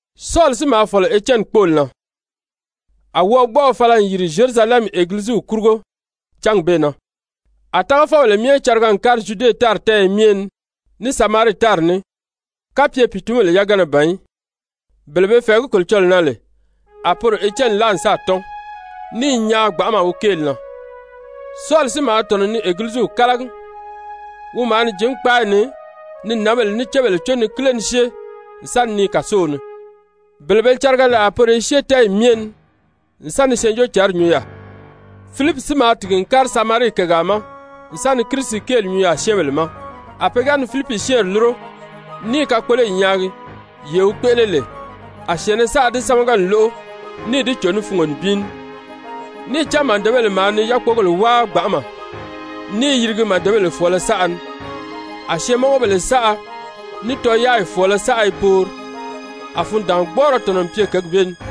Sɔli si maa fɔ̀lɔ Etyɛni kpóoli na. Sɔli n Egiliziw wɔʔɔ A wɔʔɔgbɔʔɔ fala n yìri Zyerusalɛmi Egiliziw kurugo cángi bee na. A tágafɔbèle myɛ cariga n kári Zyude tári tɛ́ɛyɛ myɛ ni ní Samarii tári ní, kapye pìitunbèle yagana ban í. Bele be fɛ̀ɛgí Kolocɔlɔɔ na lè, a poro Etyɛni láa n sáà tɔ́n, ní i nyaan gbanʔama wi kéeli na. Sɔli si maa tɔ̀nɔ ni Egiliziw kálagi. Wi maa ni jǐn kpáayi ni, ni nǎnbèle ní cébèle có ni kíle ni syée n sa ni nii kàsow ni. Bele be cariga lè a poro i syée tɛ́ɛyi myɛ ni n sa ni Syɛɛnjóocǎnri nyuu yaà. Filipi si maa tìgi n kári Samarii kègaa ma n sa ni Kirisi kéeli nyuu yaà syɛ́ɛnbèle ma. A pe ga ni Filipi syɛ́ɛnri lúro ní i kakpoloyi nyaagi, yee wi kpéʔele lè, a syɛ̀ɛnnɛ saʔa di sámaga n lóʔo, níì di cò ní fungo nibin ní. Níì cán màdebèle maa ni yákpogèle wáa gbanʔama ní i yirigi màdebèle fɔ̀ɔlɔ saʔa ni, a syɛɛnmɔngɔbèle saʔa ní tɔyaayi fɔ̀ɔlɔ saʔa i poori. A fundaangbɔɔrɔ tɔ̀nɔ n pye kěgi bee ni.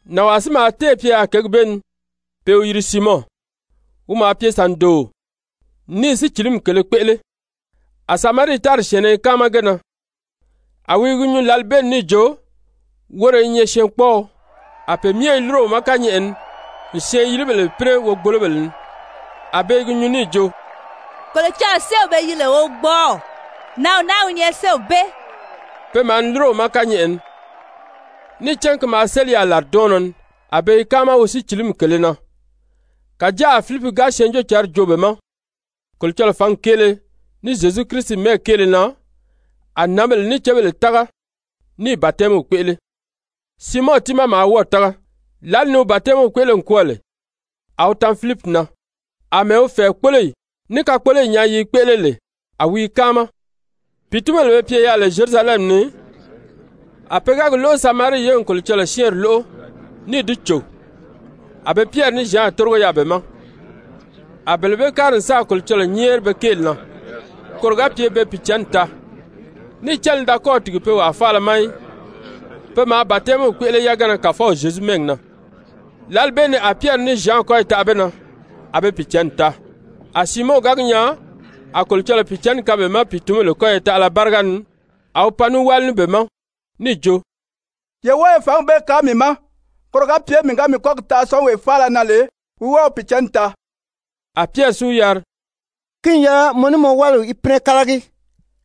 Nànwaa si maa téè pye yaà kěgi bee ni pe i wi yiri Siimɔn, wi maa pye sàndooo ní i sícilimi kèlē kpéʔele, a Samarii tári syɛ̀ɛnnɛ i káama ge na, a wi i gi nyuu lǎli bee ni níì jo, woro i nyɛ syɛɛnkpɔɔɔ. A pe myɛ i lúro wi ma kányɛʔɛ ni n syɛɛn-yilibèle pínɛ wogbolobèle ni, a be i gi nyuu níì jo: «Kolocɔlɔɔ séew be yiri lè Wogbɔɔw, nǎnw naa wi nyɛ séew bee.» Pe maa ni lúro wi ma kányɛʔɛ ni, níì cán ki maa séli yaà làridɔɔnnɔ ni, a be i káama wi sícilimi kèlē na. Kàjáa a Filipi ga Syɛɛnjóocǎnri joo be ma Kolocɔlɔɔ fǎngi kéele, ní Zyezu Kirisi mɛ́ɛgi kéele na, a nǎnbèle ní cébèle tága níì batɛmiw kpéʔele. Siimɔn tiimaa maa wɔ́ɔ̀ tága, lǎli ni wi batɛmiw kpéʔele n kwɔ́ɔ lè, a wi tan Filipi na, àmɛɛ wi fɛ̀ɛkpoloyi ní kakpoloyi nyaa yi i kpéʔele lè, a wi i káama. Pìitunbèle be pye yaà lè Zyerusalɛmi ni, a pe ga gi lóʔo Samarii ye n Kolocɔlɔɔ syɛ́ɛnri lóʔo níì di cò, a be Pyɛri ní Zyan tórigo yaà be ma. A bele bee kári n sáà Kolocɔlɔɔ nyɛ́ɛri be kéeli na koro ga pye be Pìicǎnni taa. Níì cán li da kɔ́ɔ̀ tìgi pe wàa faala ma í. Pe maa batɛmiw kpéʔele yagana Kàfɔw Zyezu mɛ́ɛgi na. Lǎli bee ni a Pyɛri ní Zyan kɔ́yi taʔa be na, a be Pìicǎnni taa. A Siimɔn ga gi nyaa a Kolocɔlɔɔ Pìicǎnni kaan be ma pìitunbèle kɔ́yɔ taʔala báriga ni, a wi pan ní wáli ní be ma, níì jo: «Ye wɔ́ɔ ye fǎngi bee kaan mii ma, koro ga pye mii ga mii kɔ́gi taʔa syɔ́ɔnwee faala na lè wi wɔ́ɔ wi Pìicǎnni taa.» A Pyɛri si wi yari: «Ki n yɛlɛ mɔ ní mɔ wáliw í pínɛ kálagi,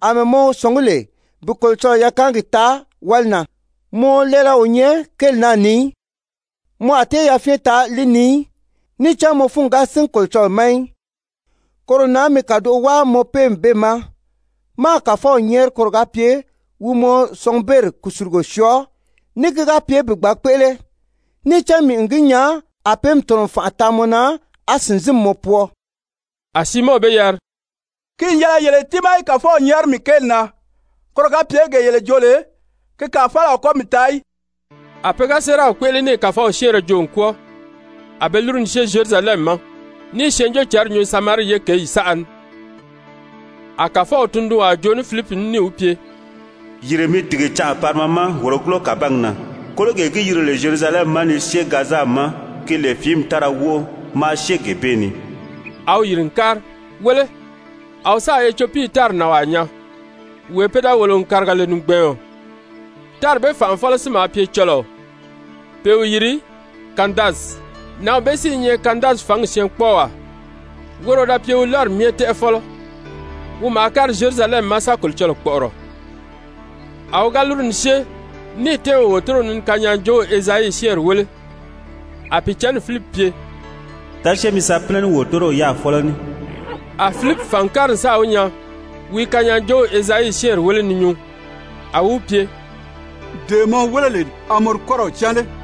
àmɛɛ mɔ sɔ̀ngí lè bi Kolocɔlɔɔ yakaangi taa wáli na. Mɔ lɛɛlɛ o nyɛ kéeli naa ni í, mɔ a tée yafyɛn taa li ni í, níì cán mɔ fúngi ga sín Kolocɔlɔɔ ma í. Koro na mi kàdoʔo wáa mɔ péemi bee ma, máā Kàfɔw nyɛ́ɛri koro ga pye wi mɔ sɔngubeeri kùsulugo syɔɔ, ní ki ga pye bi gbǎn kpéʔele. Níì cán mii n gi nyaa a péemi tɔ̀nɔ n fànʔa taa mɔ na, á sìnzinmi mɔ pwɔɔ.» A Siimɔn be yari: «Ki n yɛlɛ yele tiimaa í Kàfɔw nyɛ́ɛri mii kéeli na, koro ga pye gee yele joo lè, ki kàa faala a kɔ mii taa í.» A pe ga séeraw kpéʔele níì Kàfɔw syɛ́ɛnrɛ joo n kwɔ́ɔ, a be lúru ni syée Zyerusalɛmi ma ní i Syɛɛnjóocǎnri nyuu Samarii ye kěyi saʔa ni. A Kàfɔw tundunwaa joo ní Filipi ní níì wi pye: «Yìri mi tìgi canʔa parima ma wòrogulo kàbangi na, kólogee gi yìri lè Zyerusalɛmi ma ni syée Gaza ma ki lè fìími tára wóʔo, maa syée gee bee ni.» A wi yìri n kári. Wéle, a wi sáà Etyopii tári nànwaa nyaa, wee pe da wòlo n kàriga lè nìgbɛɛɔn. Tári bee fànʔafɔlɔ si maa pye cɔlɔɔ, pe i wi yiri Kandasi, nǎnw bee si i nyɛ Kandasi fǎngi syɛɛnkpɔɔwaa, woro wi da pye wi lɔ́ri myɛ tɛ́ʔɛfɔlɔ, wi maa kári Zyerusalɛmi ma sa Kolocɔlɔɔ kpɔ̀ʔɔrɔ. A wi ga lúru ni syée níì tɛ́ɛn wi wòtorow ni ni kanyaajoow Ezayi syɛ́ɛnri wéle, a Pìicǎnni Filipi pye: «Da syée mi sa pínɛ ní wòtorow yaa fɔ́lɔ ní.» A Filipi fàn n kári n sáà wi nyaa wi i kanyaajoow Ezayi syɛ́ɛnri wéle ni nyuu, a wi wi pye: «Dee mɔ wéle lè a mɔ di kɔ́rɔw cán lé?»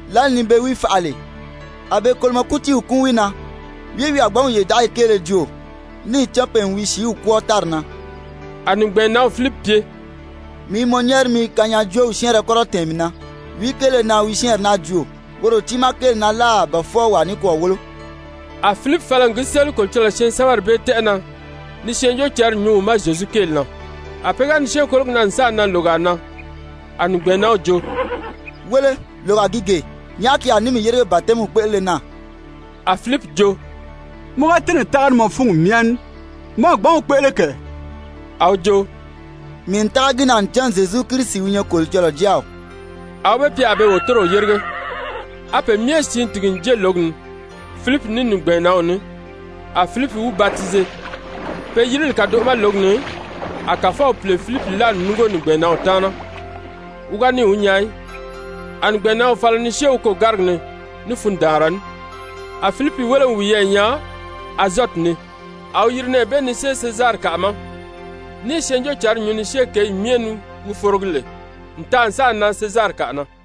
Lǎli ni be wi faʔa lè, a be kolomɔ kútiiw kúun wi na, wìí wi a gbǎn wi yòdaʔaya kéele joo? Níì cán pe n wi sìíw kwɔ́ɔ tári na.» A nìgbɛɛnnanw Filipi pye: «Mii i mɔ nyɛ́ɛri mi kanyaajoow syɛ́ɛnrɛ kɔ́rɔ tɛ̀ɛn mii na, wìí kéele na wi syɛ́ɛnri naa joo, woro tiimaa kéeli na láà ba fwɔɔ wàa nikwɔɔ wólo?» A Filipi fala n gi séli Kolocɔlɔɔ syɛɛnsɛbɛri bee tɛ́ʔɛ na ni Syɛɛnjóocǎnri nyuu wi ma Zyezu kéeli na. A pe ga ni syée kólogi na n sáà nan lògaa na, a nìgbɛɛnnanw jo: «Wéle, lògaa gi gee. Nyàʔá ki a ní mii yérige batɛmiw kpéʔelele na?» [A Filipi jo: «Mɔ ga tɛ́nɛ̀ tága ní mɔ fúngi myɛ ní, mɔ a gbǎn wi kpéʔele kɛ.» A wi jo: «Mii n tága gi na ncan Zyezu Kirisi wi nyɛ Kolocɔlɔɔ Jáaw.»] A wi be pye a be wòtorow yérige. A pe myɛ siin tìgi n jée lǒgi ni, Filipi ní nìgbɛɛnnanw ní, a Filipi wi batize. Pe yirili kàdoʔo ma lǒgi ni, a Kàfɔw Pìle Filipi láa n núngo nìgbɛɛnnanw taana, wi ga níì wi nyaa í, a nìgbɛɛnnanw fala ni syée wi kôgárigi ni ní fundaanra ní. A Filipi wéle n wiyɛɛ nyaa Azɔti ni, a wi yiri nɛɛ bee ni syée Sezarikaʔa ma, ní i Syɛɛnjóocǎnri nyuu ni syée kěyee myɛ ni wi forogi lè n taa n sáà nan Sezarikaʔa na.